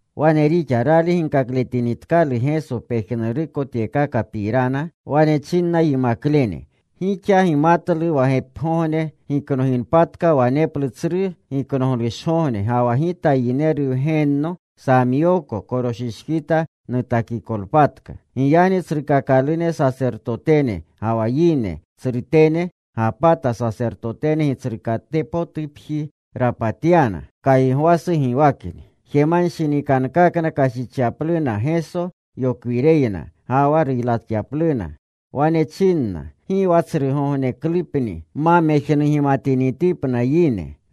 Wane rixa. Rali ginkakletinitkalu Geso pejnuruko tyekakapirana, wane chinna yimaklene, “Gixa gimatlu wa gepigogne giknoginpatka, waneplu Tsru Giknoglushgogne ga wa Gita Yineru Wgenno samyooko, koroshishkita nutakikopatka.” Giyagni tsrukakalune sasertotene, ga wa yine tsrutene gapata. Sasertotene gitsrukatpotupji rapatyana. Kaygwasu giwakni. Jemanshinikankakna kashichyapluna Geso yokwireyna, ga wa ruylatyapluna. Wane chinna, “Gi wa tsrugogneklupni. Ma mejnugimalewatinitipna yine.”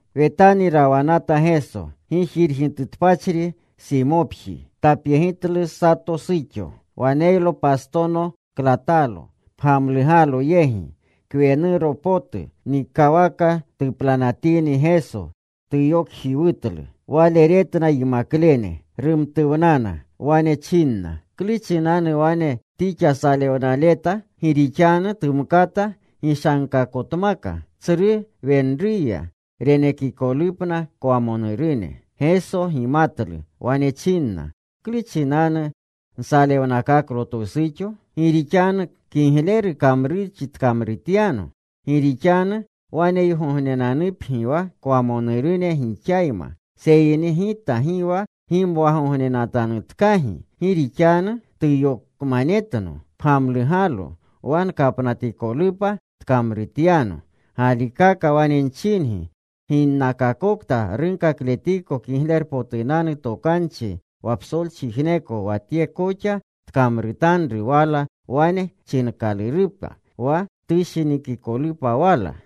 Wetani rawanata Geso, gijirgitutpachri Simopji. Tapyegitlu sato suxo. Waneylo pastono klatalo, pgamlugalu yegi. Kwenuru potu. Nikawaka tuplanatini Geso, tuyokjiwutlu. Wale retna yimaklene. Rumtuwnana. Wane chinna, “¿Klu chinanu wane tixa salewnaleta? Gi rixanu tumkata gishankakotmaka tsru wenruya, renekikolupna kwamonurune.” Geso gimatlu. Wane chinna, “¿Klu chinanu nsalewnakaklo twu suxo? Gi rixanu kigleru kamrurchi tkamrutyano. Gi rixanu waneygognenanupgi wa kwamonurune gixayma, seyni Gita gi wa gimwagognenanutanutkagi. Gi rixanu tuyokmanetno pgamlugalo, wa nkapnatikolupa tkamrutyano. Galikaka wane nchingi, ginakakokta runkakletiko Kiglerupotunanu Tokanchi wa psolchijneko wa tye koxa tkamrutanru wala wane chinkalurupa wa tushinikikolupa wala.”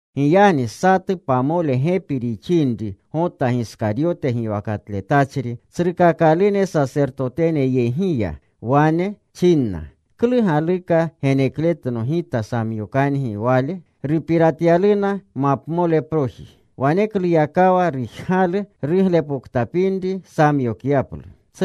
Giyagni satu pamole gepi rixinri, Gota Giskaryote giwakatletachri tsrukakalune sasertotene yegi ya. Wane chinna, “¿Klu galuka genekletno, gita samyokangi Wale?” Rupiratyaluna mapmoleproji. Wanekluyakawa rujgalu ruglepoktapinri samyokyaplu.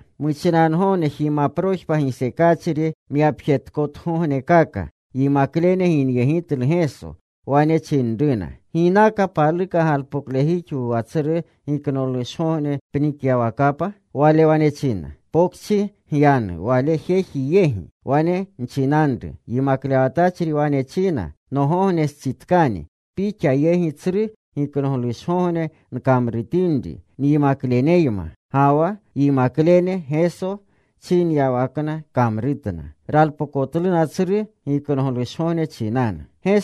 Muchinangogne jimaprojpa gisekachri myapjetkotugognekaka yimaklene ginyegitlu Geso. Wane chinruna, “¿Ginaka paluka galpoklejixwu wa Tsru Giknoglushgogne pnikyawakapa?” Wale wane china, “Pokchi gyanu wale jeji yegi. Wane nchinanru, ‘Yimaklewatachri wane china, “Nogognestsitkani. Pixa yegi Tsru Giknoglushgogne nkamrutinri nyimamkleneyma”’” Ga wa yimaklene Geso chinyawakna kamrutna. Ralpokotluna Tsru Giknoglushgogne chinanu.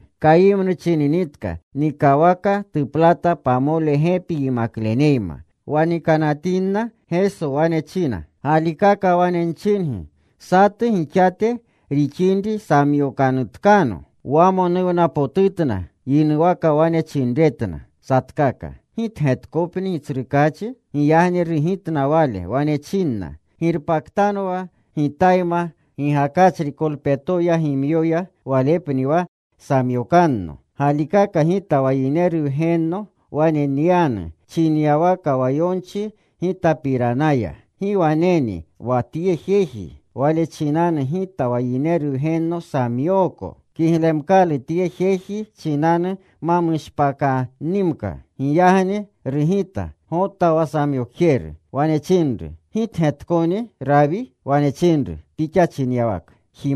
Kayimnu chininitka nikawaka tuplatatka pamole gepi yimakleneyma. Wa nikanatinna, Geso wane china, “Galikaka wane nchingi, satu gixate rixinri samyokanutkano.” Wamonuwnapotutna. Yinuwaka wane chinretna satkaka, “¿Gitgetkopni, Gitsrukaachi?” Giyagni rugitna Wale. Wane chinna, “Girpaktanwa Gitayma gigakachri kolpetoya gimyoya, walepni wa samyokanno. Galikaka Gita wa Yineru Wgenno wane nyanu chinyawaka wa yonchi Gitapiranaya. ¡Gi waneni wa tye jeji, wale chinanu Gita wa Yineru Wgenno samyooko! Kiglemkalu tye jeji chinanu ma mushpaakannimka.” Giyagni rugita Gota wa samyokjeru. Wane chinru, “¿Gitgetkoni, Rawi?” Wane chinru, “Pixa chinyawaka.”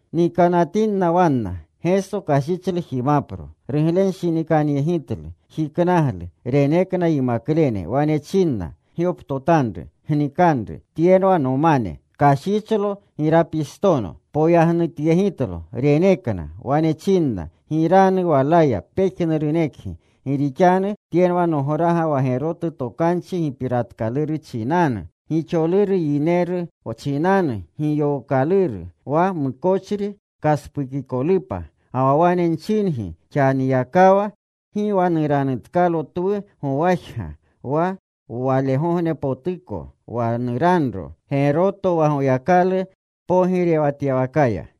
Nikanatinna wanna, Geso kashichlu jimapro. Ruglenshinikanyegitlu. Jiknaglu. Renekna yimaklene. Wane chinna, “Gyoptotanru. Gnikanru. Tyenwa nomane.” Kashichlo girapistono. Poyagnutyegitlo. Renekna. Wane chinna, “Giranu walaya pejnurunekgi. Gi rixanu tyenwa nograga wa gerotu tokanchi gipiratkaluru chinanu, gixoluru yineru chinanu giyookaluru, wa mukochri kaspukikolupa. Ga wa wane nchingi, xaniyakawa gi wa nuranutkalo twu gowajga wa walegognepotuko wa nuranro geroto wa Goyakalu pogirewatyawakaya.”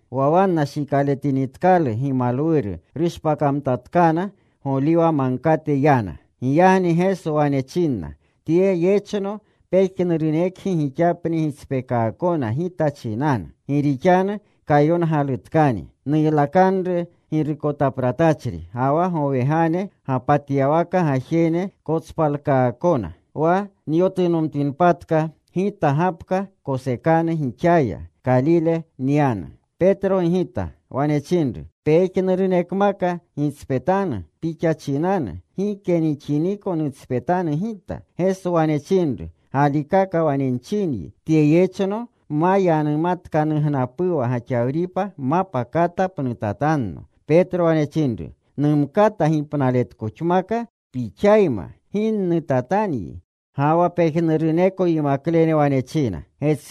Wa wanna shikaletinitkalu gimalwuru, rushpakamtatkana. Goliwa Magkate yana. Giyagni Geso wane chinna, “Tye yechno pejnurunekgi gixapni gitspeekaakona Gita chinanu. Gi rixanu kayongalutkani: Nuylakanru girukotapratachri, ga wa gowegane gapatyawaka gajene kotspalkaakona. Wa nyotunotinpatka, Gita gapka kosekanu gixaya. Kalile nyanu.” Petro gigita. Wane chinru, “Pejnurunekmaka gitspetanu Pixa chinanu, gike nixiniko nutspetanu gita.” Geso wane chinru, “Galikaka wane chinyi, tye yechno ma yanumatkanugnapuwa gaxawripa, mapa kata pnutatanno.” Petro wane chinru, “Numkata gipnaletankoxmaka Pixayma, gi nnutatanyi.” Ga wa pejnuruneko yimaklene wane china.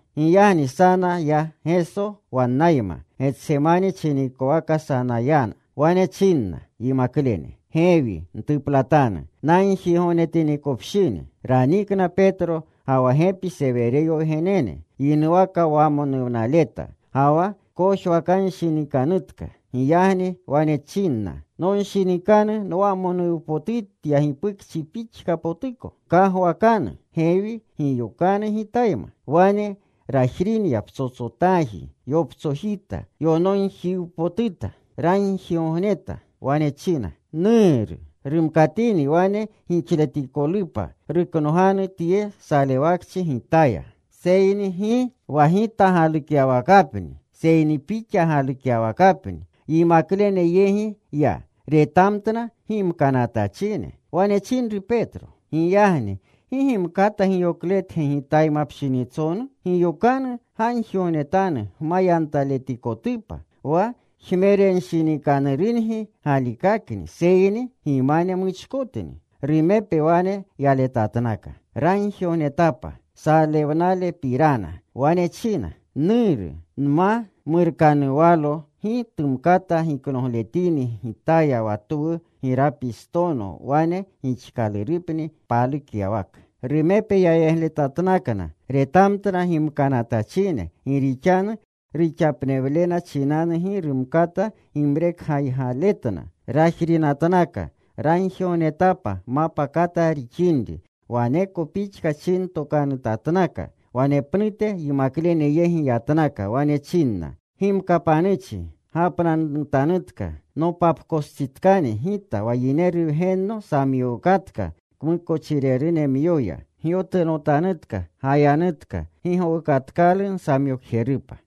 Giyagni sana ya Geso wannayma. Getsemani chinikowaka sana yana. Wane chinna yimaklene, “Gewi ntuplatanu, nagjigognetapinikopshini.” Ranikna Petro ga wa gepi Sewereyo wgenene. Yinuwaka wamonuwnaleta. Ga wa kojwakanshinikanutka. Giyagni wane chinna, “Nonshinikanu nwamonuwnapotutya gipukchi pixka potuko. Gkagwakanu gewi. Giyokanu Gitayma.” Wane rajrinya psotsotaaji. Yoptsojita. Yonoogojpotuta. Ragjigogneta. Wane china, “Nuru, rumkatini wane gixletikolupa, ruknoganu tye salewakchi Gitaya, seyni gi wa Gita galukyawakapni, seyni Pixa galukyawakapni.” Yimaklene yegi ya. Retamtna gimkanatachine. Wane chinru Petro, “Giyagni ¿gi gimkata giyokletge Gitayma pshinitsonu? Giyokanu. Gagjigognetanu gma yantaletikotupa. Wa jmerenshinikanurungi galikakni, seyni gimane muchkotni.” Rumepe wane yaletatnaka. Ragjigognetapa salewnalepirana. Wane china, “Nuru, nma murkanuwalo gi tumkata giknogletini Gitaya wa twu girapistono, wane gixkalurupni palukyawaka.” Rumepe yayegletatnakna. Retamtna gimkanatachine, gi rixanu ruxapnewlena chinanu gi rumkata gimrekaygaletna. Rajrinatnaka. Ragjigognetapa mapa kata rixinri. Waneko pixka chintokanutatnaka. Wanepnute yimaklene yegi yatnaka. Wane chinna, “Gimkapanuchi. Gapnanutanutka. Nopapkostsitkani Gita wa Yineru Wgenno samyookotka kmukochirerunemyoya. Gyotunotanutka. Gayanutka. Gi gowukatkalu nsamyokjerupa.”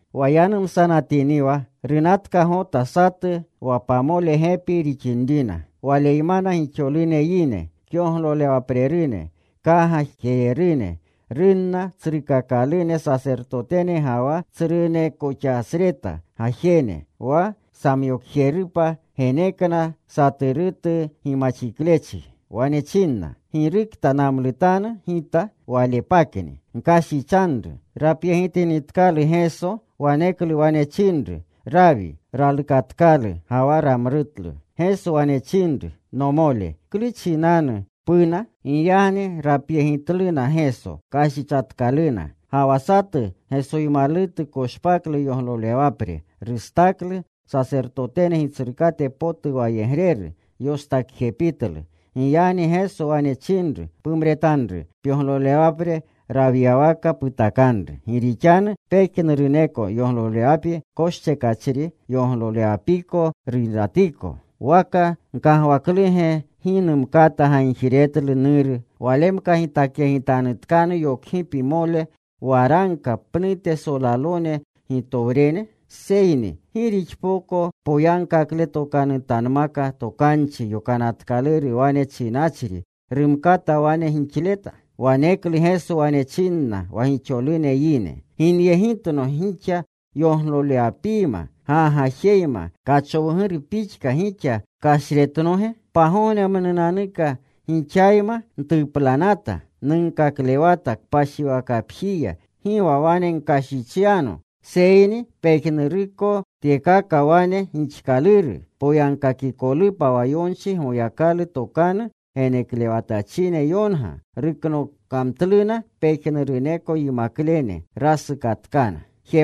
Wa yanumsanatiniwa, runatka Gota satu wa pamole gepi rixinrina. Waleymana gixolune yine kyoglolewaprerune, kgagajererune. Runna tsrukakalune sasertotene ga wa tsrunekoxasreta gajene. Wa samyokjerupa genekna saturutu gimaxiklechi. Wane china, “Girukta namlutanu gita, Walepakni. Gkashichanru.” Rapyegitinitkalu Geso, waneklu wane chinru, “¡Rawi!” Ralukatkalu ga wa ramlutlu. Geso wane chinru, “Nomole, ¿klu chinanu puna?” Giyagni rapyegitluna. Geso. Kashichatkaluna. Ga wa satu Gesoymalutu koshpaklu yoglolewapre. Rustaklu sasertotene gitsrukate potu wayegreru. Yostakjepitlu. Giyagni Geso wane chinru, “Pumretanru pyoglolewapre. Rawyawaka putakanru. Gi rixanu pejnuruneko yoglolewapi koschekachri, yoglolewapiko ruylatiko. ¿Waka gkagwakluge gi numkata gagjiretlu Nuru; Walemka gitakyegitanutkano yokgipimole waragka pnute solalone gitowrene? ¿Seyni gi rixpoko poyagkaakotanmaka Tokanchi Yonatkaluru wane chinachri rumkata wane gixleta?” Waneklu Geso wane chinna wa gixolune yine, “¿Ginyegitno gixa yoglolewapiyma gagajeyma, kachowguru pixka gixa kashretnoge? Pagognemnunanuka gixayma ntuplanata. Nunkaklewata kpashiwakapjiya. Gi wa wane gkashichyano. Seyni pejnuruko tyekaka wane gixkaluru poyagkakikolupa wa yonchi, Goyakalu tokanu geneklewatachine yonga.” Ruknokamtluna pejnuruneko yimaklene. Rasukatkana.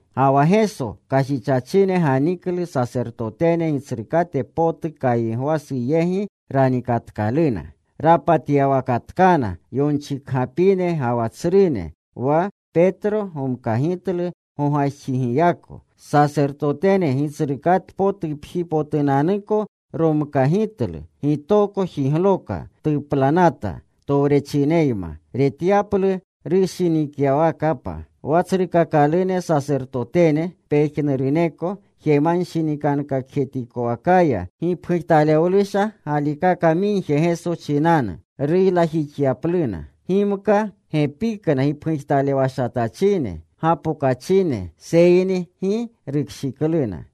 Ga wa Geso kashichachine ganiklu. Sasertotene gitsrukate potu Kaygwasu yegi ranikatkaluna, rapatyawakatkana yonchikgapine ga wa tsrune. Wa Petro gomkagitlu gogajxigiyako. Sasertotene gitsrukatpotupjipotunanuko romkagitlu. Gitoko jigloka. Tuplanata towrechineyma retyaplu rushinityawakapa. Wa tsrukakalune sasertotene, pejnuruneko jemanshinikankakjetikowakaya rujgaluna gipujtalewlusha galikaka migje Geso chinanu ruylajixyapluna. Gimka gepikna gipgujtalewashatachine gapokachine, seyni gi rukshikluna.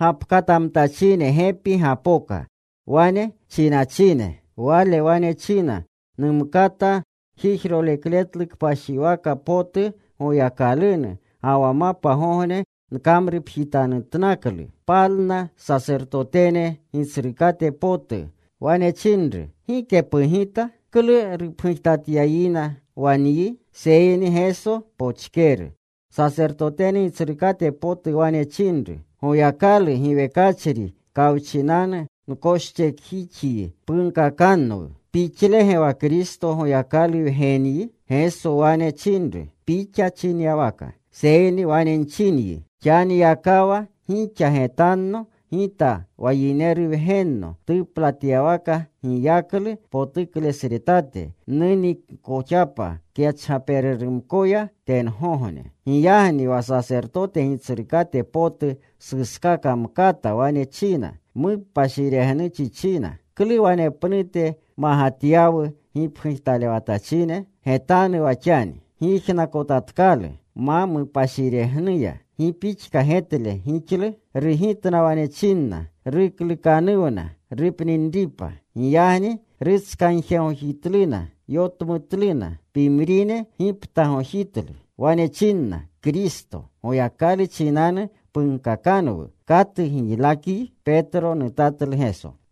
Gapkatamtachine gepi gapoka, wane chinachine, “Wale wane china, ‘Numkata jijrolekletlu kpashiwaka potu Goyakalunu, ga wa mapgogne nkamrupjitanutnaklu.’” Palna sasertotene gitsrukate potu. Wane chinru, “¿Gike pugita? ¿Klu rupgujtatyayina wa nyi?” Seyni Geso pochkeru. Sasertotene gitsrukate potu wane chinru, “Goyakalu giwekachri kawchinanu nkoschekjixyi. Punkakanwu, ¿Pixlege wa Kristo, Goyakalu Wgenyi?” Geso wane chinru, “Pixa chinyawaka. Seyni wane nchinyi, Xaniyakawa gixa getanno Gita wa Yineru Wgenno tuplatyawakapa giyaklu potuklesretate, nuninkoxapa kyachgapererumkoya tengogne.” Giyagni wa sasertote gitsrukate potu suskamkata. Wane china, “Mupashiregnuchi china. ¿Klu wanepnute magatyawu gipgujtalewatachine? Getanu wa xani. Gyijnakotatkalu ma mupashiregnuya. ¿Gi pixka getle gixlu?” Rugitna. Wane chinna, “Ruklukanuwna rupninripa.” Giyagni rutskagjegojitluna. Yotmutluna. Pimrine giptagojitlu. Wane chinna, “Kristo, Goyakalu chinanu punkakanwu: ¿Katu giylakyi?”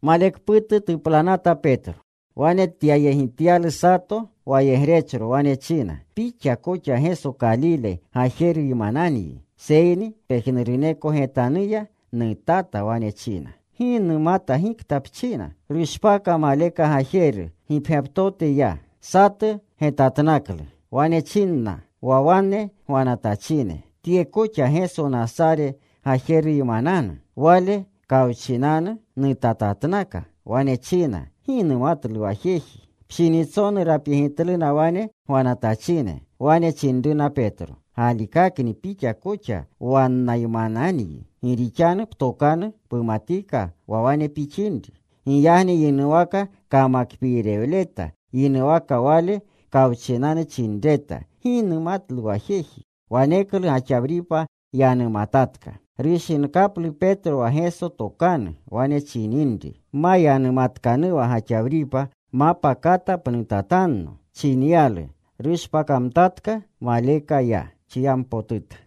Malekputu tuplanata Petro. Wane tapyegityalu sato wayegrechro. Wane china, “Pixa koxa Geso Kalile gajeruymananyi.” Seyni pejnuruneko getanuya nutata. Wane china, “Gi numata gikta pchina.” Rushpaka. Maleka gajeru gipgyaptote ya. Satu getatnaklu. Wane chinna wa wane gwanatachine, “Tye koxa Geso Nasare gajeruymananu.” Wale kawchinanu nutatatnaka. Wane china, “Gi numatlu wa jeji.” Pshinitsonu rapyegitluna wane gwanatachine. Wane chinruna Petro, “Galikakni pixa koxa wannaymananyi. Gi rixanu ptokanu pumatika wa wane pixinri.” Giyagni yinuwaka kamakpiirewleta. Yinuwaka Wale kawchinanu chinreta, “Gi numatlu wa jeji.” Waneklu gaxawripa yanumatatka. Rushinkaplu Petro wa Geso tokanu, wane chininri, “Ma yanumatkanuwa gaxawripa, mapa kata pnutatanno,” chinyalu. Rushpakamtatka. Maleka ya. Chiyampotuta.